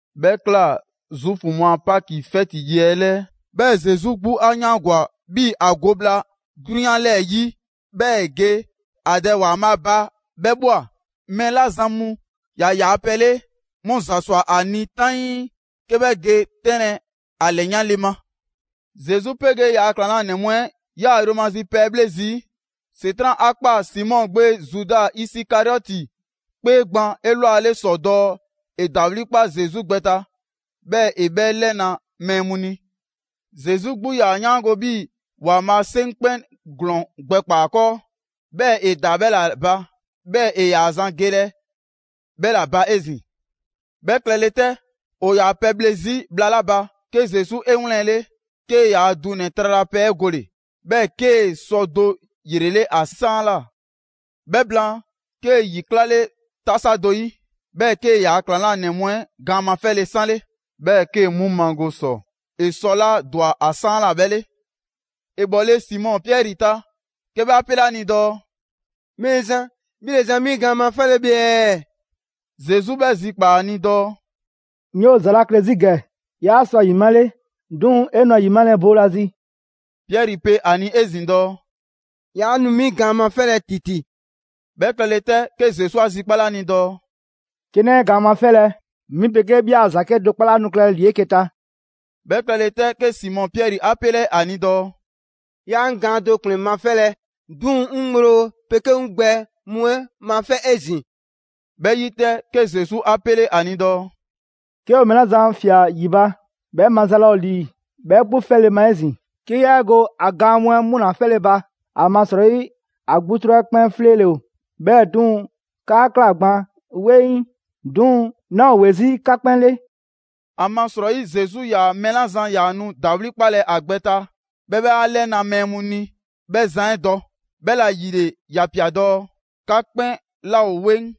'Bhɛ ꞊kla Zuufu mu a Paki 'fɛti yi 'ɛ 'lɛɛ. 'Bhɛɛ‑ Zesu 'gbu 'a 'yaangwa‑ 'bhii‑ ‑a go bhla 'drunyan 'lɛɛ‑ 'yi, 'bhɛɛ ‑e ge ‑a Dɛ ‑Waanbhaa' ba 'bhɛ ꞊bhwa. Mɛɛ 'la zan mu ‑yaa yaa pɛ 'le, 'mu ‑za ‑swa ‑a ni 'taŋii, 'ke 'bhɛ ge 'tɛnlɛ‑ ‑a ‑lɛyanle ma. Zesu 'pegee ‑yaa' ‑klaŋlanɛ mu 'ɛ ‑yaa yromazi pɛ 'ɛ 'bhle zii'. ‑Setran' 'a ꞊kpaa Simɔ gbe Zuda Isikariɔti 'kpee gban 'elwale ‑sɔ dɔɔ ‑e ‑dawli' 'kpa Zesu gbɛ ta, 'bhɛɛ‑ ‑e 'bhɛ 'lɛna‑ mɛɛ mu ni. Zesu 'gbu 'yaa‑ 'yaango‑ 'bhii‑ ‑Waanbhaa' 'seŋ 'kpɛn ‑glɔɔn gbɛkpaa‑ ‑a 'kɔɔ, 'bhɛɛ‑ ‑e ‑daa 'bhɛ ‑la ba, 'bhɛɛ‑ ‑e ‑yaa zan gelɛ 'bhɛ ‑la ba 'ezin‑. 'Bhɛ klɛle 'tɛ, ‑o ‑yaa pɛbhle 'zi bhla 'la ba, 'ke Zesu 'e 'wlɛnle‑, 'kee‑ ‑yaa dunɛ‑ tralapɛ 'ɛ gole‑, 'bhɛɛ‑ 'kee‑ sɔ do ‑yrele' ‑a 'saanla꞊. 'Bhɛ blaan, 'kee‑ ‑yi 'klale 'tasa do 'yi, 'bhɛɛ‑ 'kee‑ ‑yaa' ‑klaŋlanɛ mu 'ɛ gaan mafɛle 'sanle, 'bhɛɛ‑ 'kee‑ 'mu mago ‑sɔ ‑e sɔ 'la ‑dwa ‑a 'saanla꞊ 'bhɛ 'le. ‑E bhɔle Simɔ Piɛri ta, 'ke 'bhɛ 'a 'pele ‑a ni dɔɔ: «Mɛɛzan, 'bhi ‑le zan 'mi gaan mafɛlɛ bhe ɛɛ?» Zesu 'bhɛ zikpaa ‑a ni dɔɔ: «'Ŋ 'yoo‑ ‑za 'la klɛ 'zi ‑gɛ, 'yaa sɔ ‑a ‑yimale, 'duŋ‑ 'e nu ‑a ‑yimalɛ boolazi.» Piɛri pe ‑a ni 'ezin‑ dɔɔ: «'Yaa nu 'mi gaan 'mafɛlɛ ‑titi!» 'Bhɛ klɛle 'tɛ, 'ke Zesu 'a zikpale ‑a ni dɔɔ: «'Ke 'naa 'e gaan mafɛlɛ, 'mi 'pegee 'bhi a ‑za 'kedo‑ 'kpɔ 'laa nu klɛlɛ ‑li 'eke‑ ta.» 'Bhɛ klɛle 'tɛ, 'ke Simɔ Piɛri 'a 'pele ‑a ni dɔɔ: «'Yaa 'ŋ gaan do ‑kplɛn mafɛlɛ, 'duŋ‑ 'ŋ ŋgblo 'pegee 'ŋ gbɛ mu 'ɛ mafɛ' 'ezin‑!» 'Bhɛ 'yi 'tɛ, 'ke Zesu 'a 'pele 'a ni dɔɔ: «'Ke ‑o mɛɛ 'la zan ꞊fia ‑yi ba, 'bhɛ maza laa ‑o ‑li 'bhɛ 'gbu 'fɛle‑ ma 'ezin‑, 'ke yaa 'e go ‑a gaan mu 'ɛ 'mu ‑la mafɛle ba. ‑Amasrɔyi ‑a 'gbutru 'ɛ 'kpɛn 'fleele‑ ‑o. 'Bhɛɛ‑ 'duŋ‑, 'ka ꞊kla gban 'weŋ, 'duŋ‑ 'naa ‑o ‑we 'zi 'ka 'kpɛn 'le.» ‑Amasrɔyi Zesu 'yaa‑ mɛɛ 'la zan ‑yaa nu ‑dawli' 'kpalɛ‑ ‑a gbɛ ta, 'bhɛɛ‑ 'bhɛ 'a 'lɛna‑ mɛɛ mu ni 'bhɛ zan 'ɛ dɔ; 'bhɛla‑ ‑yile ‑ya ‑pia dɔɔ: «'Ka 'kpɛn 'laa ‑o 'weŋ.»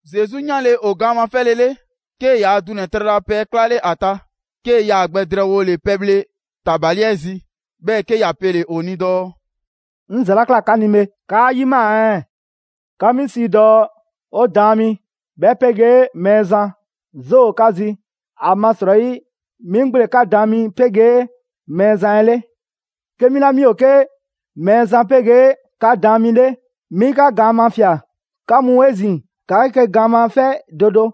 Zesu 'yanle‑ ‑o gaan mafɛlele, 'kee‑ ‑yaa dunɛ‑ tralapɛ 'ɛ 'klale ‑a ta, 'kee‑ yaa gbɛ drɛɛwole pɛbhle ‑tabali 'ɛ zi, 'bhɛɛ‑ 'ke ‑ya pele‑ ‑o ni dɔɔ: «'Ŋ ‑za 'la ꞊kla 'ka ni bhe, 'kaa 'yimaa‑ ɛɛ? 'Ka 'mi sii dɔɔ: ‹'O Daan mi,› 'bhɛ 'pegee‹Mɛɛzan.› 'Zoo ‑o 'ka zi, ‑amasrɔyi 'mi 'gbu ‑le 'ka Daan mi 'pegee Mɛɛzan 'ɛ 'le. 'Ke 'mi 'la 'mi ‑o 'ke Mɛɛzan 'pegee 'ka Daan mi 'le, 'mi 'ka gaan mafia‑, 'ka mu 'ezin‑, ‑ka 'eke‑ gaan mafɛ' do do.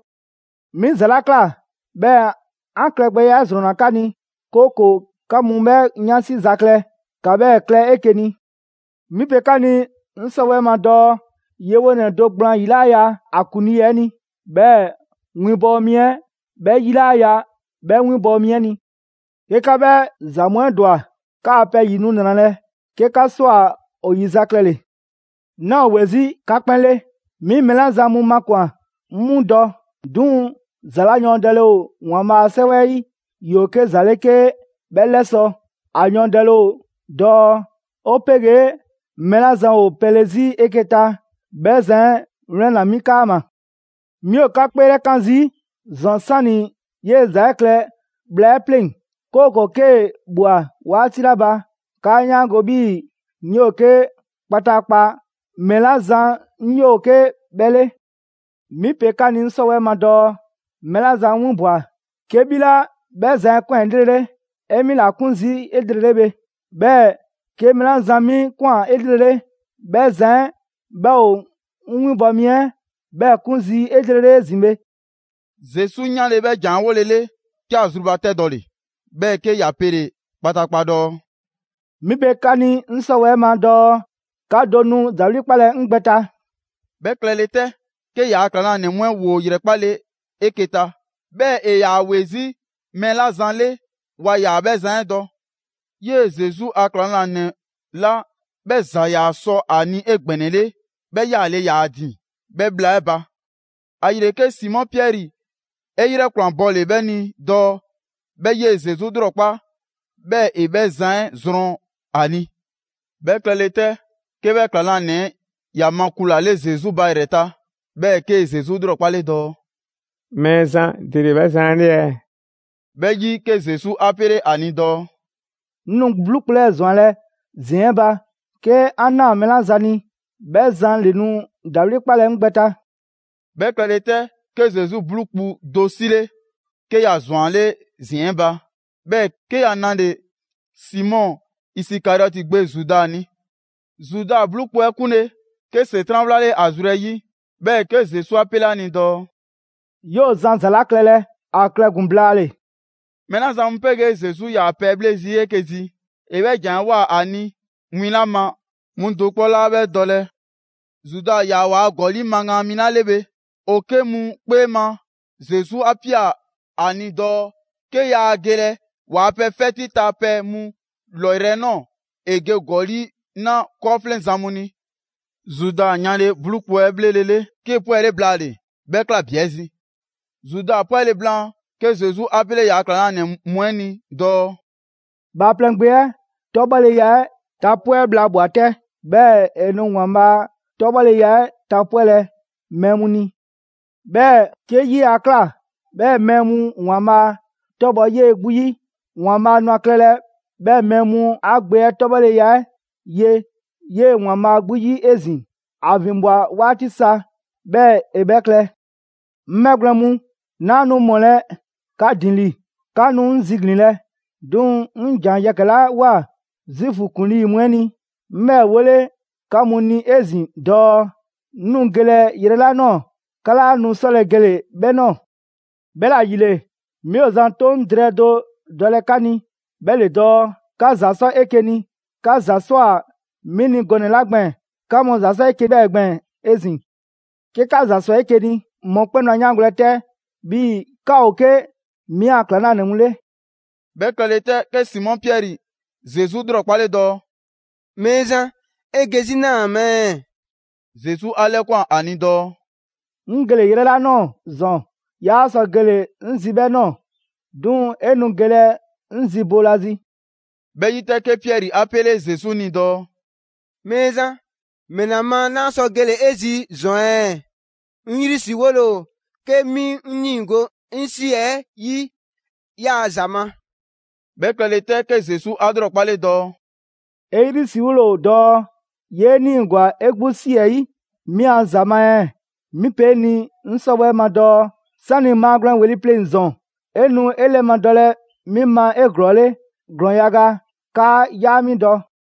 'Mi ‑za 'la ꞊kla, 'bhɛɛ‑ 'an klɛ gbɛya 'ɛ ‑zrɔnna 'ka ni, 'kooko‑ 'ka mu 'bhɛ 'yansi za klɛ, ‑ka 'bhɛɛ‑ klɛ 'eke‑ ni. 'Mi pe 'ka ni 'ŋ 'sɔwɛɛ‑ ma dɔɔ yewonɛ do gblaan ‑yi 'laa ya ‑a ‑kuŋlii 'ɛ ni, 'bhɛɛ‑ winbɔwo mi 'ɛ 'bhɛ 'yi 'laa ya 'bhɛ 'winbɔ‑ mi 'ɛ ni. 'Ke 'ka 'bhɛ ‑za mu 'ɛ ‑dwa, 'kaa pɛ ‑yi nu ‑nralɛ' 'ke 'ka ꞊swa ‑o ‑yizaklɛle. 'Naa ‑o ‑we 'zi 'ka 'kpɛn 'le. 'Mi mɛɛ 'la zan mu makwan‑, 'ŋ 'mu dɔ. 'Duŋ‑ ‑za 'la yɔɔndɛle ‑o ‑Waanbhaa' a 'Sɛwɛ 'ɛ 'yi, ‑yoo 'ke ‑za ‑le 'ke 'bhɛ 'lɛsɔ‑. ‑A yɔɔndɛlɛ ‑o dɔɔ: ‹'O 'pegee mɛɛ 'la zan ‑o pɛle 'zi 'eke‑ ta, 'bhɛ zan 'ɛ 'wlɛnna‑ 'mi 'kaama‑.› Mi ‑o 'ka 'kpeelɛkan zii' ‑zɔn 'sani‑ 'yee‑ ‑za 'ɛ klɛ bhla 'ɛ pleŋ‑. 'Kooko‑ 'kee‑ ꞊bhwa 'waati 'la ba, 'kaa 'yaango‑ 'bhii‑ ‹'Ŋ 'yoo‑ 'ke kpataakpa mɛɛ 'la zan 'ŋ 'yoo 'ke 'bhɛ 'le.› 'Mi pe 'ka ni 'ŋ 'sɔwɛɛ‑ ma dɔɔ: Mɛɛ 'la zan 'ŋ 'winbwa‑, 'ke 'bhi 'la 'bhɛ zan 'ɛ ‑kwan 'elrele, 'e 'mi ‑la 'kun zii' 'elrele bhe. 'Bhɛɛ‑ 'ke mɛɛ 'la zan 'mi ‑kwan 'elrele, 'bhɛ zan 'ɛ 'bhɛ ‑o 'ŋ 'winbɔ‑ mi 'ɛ 'bhɛɛ‑ 'kun zii' 'elrele 'ezin‑ bhe.» Zesu 'yanle‑ 'bhɛ ‑jan 'ɛ 'wolele 'ke ‑a zrubatɛdɔle‑, 'bhɛɛ‑ 'ke ‑ya pele‑ kpataakpa dɔɔ: «'Mi pe 'ka ni 'ŋ 'sɔwɛɛ‑ ma dɔɔ 'ka do nu ‑dawli' 'kpalɛ‑ 'ŋ gbɛ ta.» 'Bhɛ klɛle 'tɛ, 'ke ‑yaa' ‑klaŋlanɛ mu 'ɛ ‑woo ‑yrɛkpale 'eke‑ ta, 'bhɛɛ‑ ‑e ‑yaa ‑we 'zi mɛɛ 'la zan 'le, waa ‑yaa 'bhɛ zan 'ɛ dɔ. 'Yee‑ Zesu a ‑klaŋlanɛ 'la 'bhɛ ‑za ‑yaa sɔ ‑a ni 'egbɛnɛle, 'bhɛ 'yaale‑ ‑yaa ‑a ‑din 'bhɛ bhla 'ɛ ba. ‑Ayile, 'ke Simɔ Piɛri 'e 'yrɛ ‑kwlanbɔle 'bhɛ ni dɔɔ 'bhɛ 'yee‑ Zesu 'lrɔkpa, 'bhɛɛ‑ ‑e 'bhɛ zan 'ɛ zrɔn ‑a ni. 'Bhɛ klɛle 'tɛ, 'ke 'bhɛ ‑klaŋlanɛ 'ɛ ‑ya makulale Zesu ba ‑yrɛ ta, 'bhɛɛ‑ 'kee‑ Zesu ‑lrɔkpale dɔɔ: «Mɛɛzan, ‑dele 'bhɛ zan 'ɛ 'le ɛɛ?» 'Bhɛ 'yi 'ke Zesu 'a 'pele ‑a ni dɔɔ: «'Ŋ nu 'bluu kpu 'lɛɛ‑ ‑zwanlɛ' ‑ziɛn 'ɛ ba, 'ke 'an ꞊naa mɛɛ 'la zan ni, 'bhɛ zan ‑le nu ‑dawli' 'kpalɛ‑ 'ŋ gbɛ ta.» 'Bhɛ klɛle 'tɛ, 'ke Zesu 'bluu kpu do 'sile, 'ke ‑ya ‑zwanle' ‑ziɛn 'ɛ ba, 'bhɛɛ‑ 'ke ‑ya nale‑ Simɔ Isikariɔti gbe Zuda ni. Zuda 'bluu kpu 'ɛ 'kunle‑, 'ke ‑Setran' 'wlale ‑a zru 'ɛ 'yi; 'bhɛɛ‑ 'ke Zesu 'a 'pele a ni dɔɔ: «'Yoo‑ zan ‑za 'la klɛlɛ, ‑a klɛ ‑gun blaale‑!» Mɛɛ 'la zan mu 'pegee Zesu 'yaa‑ pɛbhle 'zi 'eke‑ zi, ‑e 'bhɛ ‑jan 'ɛ ꞊woa ‑a ni win 'la ma 'mu do 'kpɔ 'laa 'bhɛ dɔlɛ. Zuda ‑yaa waa ‑gɔli' magaan mi 'la 'le bhe, ‑o 'ke mu 'kpee ma Zesu 'a ꞊pia ‑a ni dɔɔ, 'ke yaa gelɛ waa pɛ 'fɛti ta pɛ 'ɛ 'mu 'lɔyrɛ‑ nɔɔ‑, ‑e ge ‑gɔli' 'na 'kɔɔfleŋzan mu ni. Zuda 'yanle‑ 'bluu kpu 'ɛ 'bhlelele, 'kee‑ 'pwɛle blaale‑. 'Bhɛ ꞊kla bi 'ɛ zi. Zuda 'pwɛle‑ blaan, 'ke Zesu 'a 'pele ‑yaa' ‑klaŋlanɛ mu 'ɛ ni dɔɔ: «Bhaaplɛŋ Gbe 'ɛ 'tɔbhɔleya 'ɛ tapwɛ' bhla ꞊bhwa 'tɛ, 'bhɛɛ‑ ‑e nu ‑Waanbhaa' 'tɔbhɔleya 'ɛ tapwɛlɛ mɛɛ mu ni. 'Bhɛɛ‑ 'ke 'yee‑ 'a ꞊kla 'bhɛɛ‑ mɛɛ mu ‑Waanbhaa' 'tɔbhɔ‑ 'yee‑ 'gbu 'yi, ‑Waanbhaa' nu ‑a klɛlɛ 'bhɛɛ‑ mɛɛ mu 'a Gbe 'ɛ 'tɔbhɔleya 'ɛ ye 'yee‑ ‑Waanbhaa' 'gbu 'yi 'ezin‑, ‑a ‑vinbwa 'waati sa 'bhɛɛ‑ ‑e 'bhɛ klɛ. 'Ŋ 'bhɛgwlɛn‑ mu, 'naa nu ‑mɔlɛ' 'ka ‑din ‑li. 'Ka nu 'ŋ ziglinlɛ, 'duŋ‑ 'ŋ ‑jan yɛkɛ‑ 'la ꞊woa Zuufu ‑kuŋlii mu 'ɛ ni, 'ŋ 'bhɛɛ‑ 'wole 'ka mu ni 'ezin‑ dɔɔ: 'ŋ nu gelɛ yrɛ 'la ꞊nɔɔ, 'ka 'laa nu 'sɔlɛ‑ gele‑ 'bhɛ ꞊nɔɔ. 'Bhɛla‑ ‑yile, 'mi ‑o zan 'toŋ drɛɛ do dɔlɛ 'ka ni, 'bhɛ ‑le dɔɔ: 'ka ‑za 'sɔ 'eke‑ ni. 'Ka ‑za ‑swa 'mi ni gɔnɛ‑ 'la gbɛɛn‑, 'ka mu ‑za 'sɔ 'eke‑ 'bhɛɛ‑ gbɛɛn‑ 'ezin‑. 'Ke 'ka ‑za ‑swa 'eke‑ ni mɔkpɛn' nu 'a 'yaangolɛ 'tɛ 'bhii‑ 'ka ‑o 'ke 'mi a ‑klaŋlanɛ mu 'le.» 'Bhɛ klɛle 'tɛ, 'ke Simɔ Piɛri Zesu 'lrɔkpale dɔɔ: «Mɛɛzan, 'e ge 'zi 'naa ma ɛɛ?» Zesu 'a 'lɛkwan‑ ‑a ni dɔɔ: «'Ŋ gele‑ yrɛ 'la ꞊nɔɔ‑ ‑zɔn 'yaa sɔ gele‑ 'ŋ zi 'bhɛ ꞊nɔɔ, 'duŋ‑ 'e nu gelɛ 'ŋ zi boolazi.» 'Bhɛ 'yi 'tɛ, 'ke Piɛri 'a 'pele Zesu ni dɔɔ: «Mɛɛzan, ‑mɛla ma 'naa sɔ gele‑ 'e zi ‑zɔn ɛɛ? 'Ŋ 'yrisriwole ‑o 'ke 'mi 'ŋ 'niigo‑ 'ŋ ꞊si 'ɛ yi 'yaa‑ ‑za ma.» 'Bhɛ klɛle 'tɛ, 'ke Zesu 'a 'lrɔkpale dɔɔ: «'E 'yrisriwole ‑o dɔɔ 'yee 'niigwa‑ 'e 'gbu ꞊si 'ɛ 'yi 'mi a ‑za ma ɛɛ? 'Mi pe 'e ni 'ŋ 'sɔwɛɛ‑ ma dɔɔ: 'sani‑ maagwlɛn ‑weli' pleŋ‑ ‑zɔn, 'e nu 'e 'lɛmadɔlɛ 'mi ma 'eglɔɔle ‑glɔɔn yaga 'kaa 'yaa 'mi dɔ.»